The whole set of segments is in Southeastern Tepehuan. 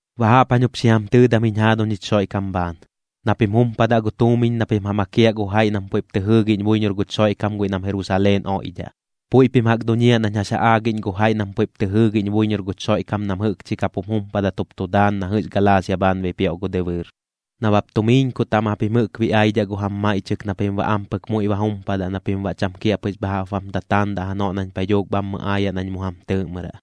Baꞌ jaꞌp jañ jup xi jam tɨɨdam jiñ jaaduñ jich Xoiꞌkam bhaan, na pim jumpadaꞌ gu tuumiñ na pim ja makiaꞌ gu jaiꞌ nam puiꞌp tɨ jɨɨgiꞌñ buiñor guch Xoiꞌkam guiꞌ nam Jerusaleen oiꞌdhaꞌ. Puiꞌ pim jaꞌk duñiaꞌ nañ jax ja aagiꞌñ gu jaiꞌ nam puiꞌp tɨ jɨɨgiꞌñ buiñor guch Xoiꞌkam nam jɨꞌkchi kap jum jumpadat jup tu daan na jɨꞌx Galaasia bhaan bipioꞌ gu dɨbɨɨr. Nabap tumiiñku taꞌm japim jɨꞌk biꞌaidhaꞌ gu jam maiꞌchɨk na pim baꞌ ampɨk muiꞌ ba jumpadaꞌ na pim baꞌ cham kiaꞌpɨx bha jaꞌp bam tataandaꞌ janoꞌ nañ paiꞌ dhuuk bhammɨ aayaꞌ nañ mu jam tɨɨꞌmɨraꞌ.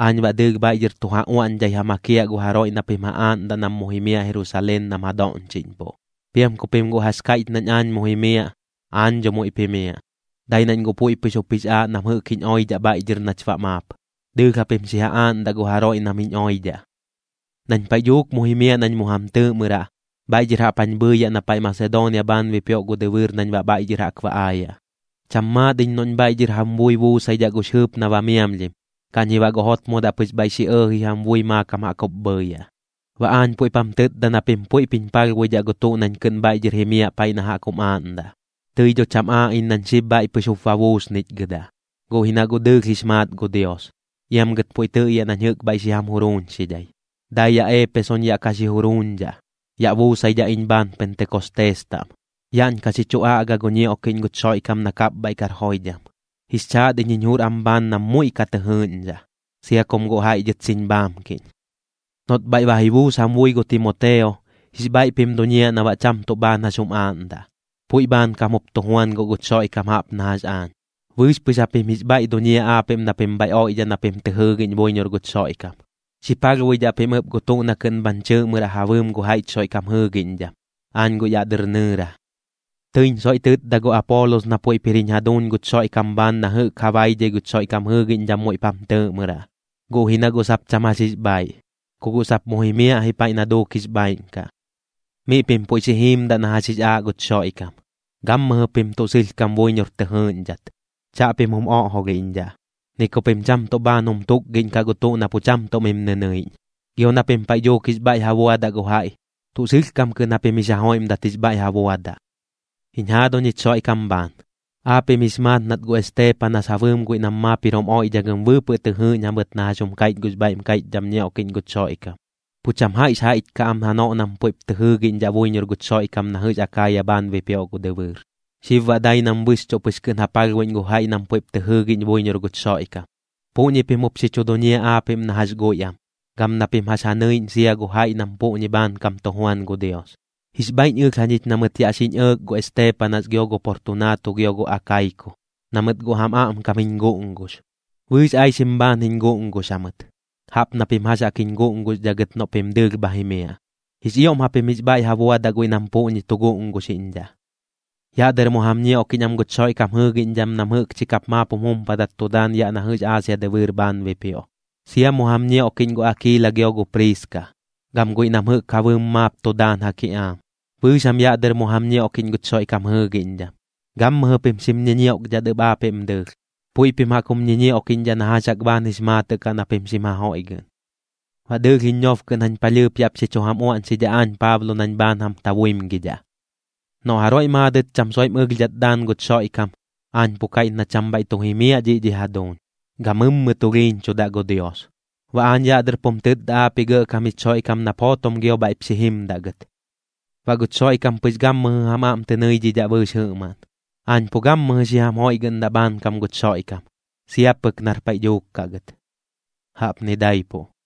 Aañ baꞌ dɨɨlh bhaiꞌ dhɨr tu ja uaꞌñdhai ja makiaꞌ gu jaroiꞌ na pim ja aaꞌndaꞌ nam mu jimiaꞌ Jerusaleen nam ja doꞌñchiꞌñpuꞌ. Piam ku pim guꞌ jax kaiꞌch nañ aañ mu jimiaꞌ, aañ dho muiꞌp jimiaꞌ, dai nañ guꞌ puiꞌ pɨx jup jix aaꞌ nam jɨꞌk jiñ oidhaꞌ bhaiꞌ dhɨr nach baꞌ maap. Dɨɨlh japim xi ja aaꞌndaꞌ gu jaroiꞌ nam jiñ oidhaꞌ. Nañ paiꞌ dhuuk muiꞌ ji jimiaꞌ nañ mu jam tɨɨꞌmɨraꞌ, bhaiꞌ dhɨr jaꞌp jañ bhɨɨyaꞌ na paiꞌ Masedoonia bhaan bipioꞌ gu dɨbɨɨr nañ baꞌ bhaiꞌ dhɨr jaꞌk ba aayaꞌ. Cham maat iñ noꞌñ bhaiꞌ dhɨr jam bui buusaidhaꞌ gux jɨɨp na ba miamlhim, kaꞌñ ji baꞌ guꞌ jotmodaꞌ pɨx bhaiꞌ xi ɇɇji jam bui maakam jaꞌk jup bhɨɨyaꞌ. Baꞌ aañ puiꞌp jam tɨtda na pim puiꞌp jiñ palhbuidhaꞌ gu tuꞌ nañ kɨꞌn bhaiꞌ dhɨr jimiaꞌ paiꞌ na jaꞌk jum aaꞌndaꞌ. Tɨi dho cham aaꞌ iñ nañ xib bhaiꞌ pɨx jup ba buusnichgɨdaꞌ, guꞌ ji na guꞌ dɨɨlh jix maat gu Dios, iam gɨt puiꞌ tɨꞌyaꞌ nañ jɨꞌk bhaiꞌ xi jam juruuñxidhai. Dai yaꞌ Eepesoñ yaꞌ ka xi juruuñdhaꞌ, yaꞌ buusaidhaꞌ iñ bhaan Pentekostees taꞌm. Yaꞌñ ka xi chu aꞌga yaꞌ oirɨt gu ñioꞌkiꞌñ guch Xoiꞌkam na kapbhaiꞌ kar joidham. Jix chaat iñ jiñ jur am bhaan nam muiꞌ ka tɨ jɨɨꞌñdhaꞌ, sia kum guꞌ jaiꞌ dhɨt xiñ bhaamkiꞌñ. Noꞌt bhaiꞌ ba ji buus jam bui gu Timoteo, jix bhaiꞌ pim duñiaꞌ na baꞌ cham tuꞌ bhaan jax jum aaꞌndaꞌ, puiꞌ bhaankam jup tu juan guꞌ guch Xoiꞌkam jaꞌp na jax aañ. Bɨɨx pɨx japim jix bhaiꞌ duñiaꞌ aapiꞌm na pim bhaiꞌ oiꞌdhaꞌ na pim tɨ jɨɨgiꞌñ buiñor guch Xoiꞌkam. Xi palhbuidhaꞌ pim ɨp gu tuꞌ na kɨꞌn bhañ chɨɨꞌmɨraꞌ ja bɨɨm gu jaiꞌch Xoiꞌkam jɨɨgiꞌñdham, aañ guꞌ yaꞌ dɨr nɨɨra. Tɨiñ soiꞌ tɨtda gu Apoolos na puiꞌp jir jich jaduuñ guch Xoiꞌkam bhaan na jɨꞌk ja baidhai guch Xoiꞌkam jɨɨgiꞌñdham muiꞌp jam tɨɨꞌmɨraꞌ, guꞌ ji na guꞌ sap cham jax jix bhaaiꞌ, ku guꞌ sap mu jimiaꞌ ji paiꞌ na duuk jix bhaaiꞌn kaꞌ. Miꞌ pim puiꞌ xi jiimdaꞌ na jax jix aaꞌ guch Xoiꞌkam, gammɨjɨ pim tuꞌ sɨlhkam buiñor tɨ jɨɨꞌñdhat. Chaꞌpim jum oꞌjolhiꞌñdhaꞌ, ni ku pim cham tuꞌ bhaan jum tukgiꞌñkaꞌ gu tuꞌ na pu cham tuꞌ mi nɨnɨiꞌñ. Gio na pim paiꞌ dhuuk jix bhaiꞌ ja buadaꞌ gu jaiꞌ, tuꞌ sɨlhkam kɨꞌn japim jix ja joiꞌmdat jix bhaiꞌ ja buadaꞌ. Jiñ jaaduñ jich Xoiꞌkam bhaan, aapiꞌm jix maat nat gu Esteepanas ja bɨɨm guiꞌ nam maap jir jum oiꞌdhagɨm bɨɨpɨꞌ tɨ jɨɨꞌñ jamɨt na jax jum kaiꞌch gux bhaiꞌm kaiꞌchdham ñioꞌkiꞌñ guch Xoiꞌkam, pu cham jaiꞌx jaiꞌch kaꞌ am janoꞌ nam puiꞌp tɨ jɨɨgiꞌñdhaꞌ buiñor guch Xoiꞌkam na jɨꞌx Akaaya bhaan bipioꞌ gu dɨbɨɨr. Xib baꞌ dai nam bɨxchuꞌ pɨx kɨꞌn ja palhbuiꞌñ gu jaiꞌ nam puiꞌp tɨ jɨɨgiꞌñ buiñor guch Xoiꞌkam. Puꞌñi pim jup xi chu duñiaꞌ aapiꞌm na jax guiꞌ am, gam na pim jax ja nɨiꞌñ sia gu jaiꞌ nam puꞌñi bhaankam tu juan gu Dios. Jix bhaiꞌñ ɨlh jañich na mɨt yaꞌ xiñ ɇɇk gu Esteepanas gio gu Portunaatu gio gu Akaiku, na mɨt guꞌ jam aꞌmkam jiñ guꞌngux. Bɨɨx aixim bhaan jiñ guꞌngux jamɨt, jaꞌp na pim jax jaꞌk jiñ guꞌnguxdhaꞌ gɨt noꞌ pim dɨɨlh bha jimiaꞌ. Jix ioꞌm japim jix bhaiꞌ ja buadaꞌ guiꞌ nam puꞌñi tu guꞌnguxiꞌñdhaꞌ. Yaꞌ dɨr mu jam ñioꞌkiꞌñ am guch Xoiꞌkam jɨɨgiꞌñdham nam jɨꞌkchi kap maap jum jumpadat tu daan yaꞌ na jɨꞌx Aasia dɨbɨɨr bhaan bipioꞌ. Sia mu jam ñioꞌkiꞌñ gu Akiila gio gu Priiska, gam guiꞌ nam jɨꞌk ja bɨɨm maap tu daan ja kiꞌaam. Bɨɨx jam yaꞌ dɨr mu jam ñioꞌkiꞌñ guch Xoiꞌkam jɨɨgiꞌñdham. Gammɨjɨ pim xim ñiñioꞌkdhat ɨp aapiꞌm dɨɨlh, puiꞌ pim jaꞌk jum ñiñioꞌkiꞌñdhaꞌ na jax jaꞌk bhaan jix maatɨꞌ kaꞌ na pim xim ja joiꞌgɨꞌn. Baꞌ dɨɨlh jiñ ñob kɨꞌn jañ palhɨɨp yaꞌp xi chu jam uaꞌñxidhaꞌ aañ Paablo nañ bhaan jam tabuimgidhaꞌ. Noꞌ jaroiꞌ maadɨt cham soiꞌm ɨlhdhat daan guch Xoiꞌkam, aañ pu kaiꞌch na cham bhaiꞌ tu jimiaꞌ dhiꞌ dhi jaduuñ, gamɨmmɨ tulhiiñchudaꞌ gu Dios. Baꞌ aañ yaꞌ dɨr pum tɨtda aapiꞌ Gɇꞌkam jich Xoiꞌkam nap jootom gio bhaiꞌp xi jimdaꞌ gɨt. Baꞌ guch Xoiꞌkam pɨx gammɨjɨ jam aꞌm tɨ nɨidhidhaꞌ bɨɨx jɨꞌmaꞌn. Aañ pu gammɨjɨ xi jam joiꞌgɨꞌndaꞌ bhaankam guch Xoiꞌkam, sia pɨk nar paiꞌ dhuuk kaꞌ gɨt. Jaꞌpni daipuꞌ.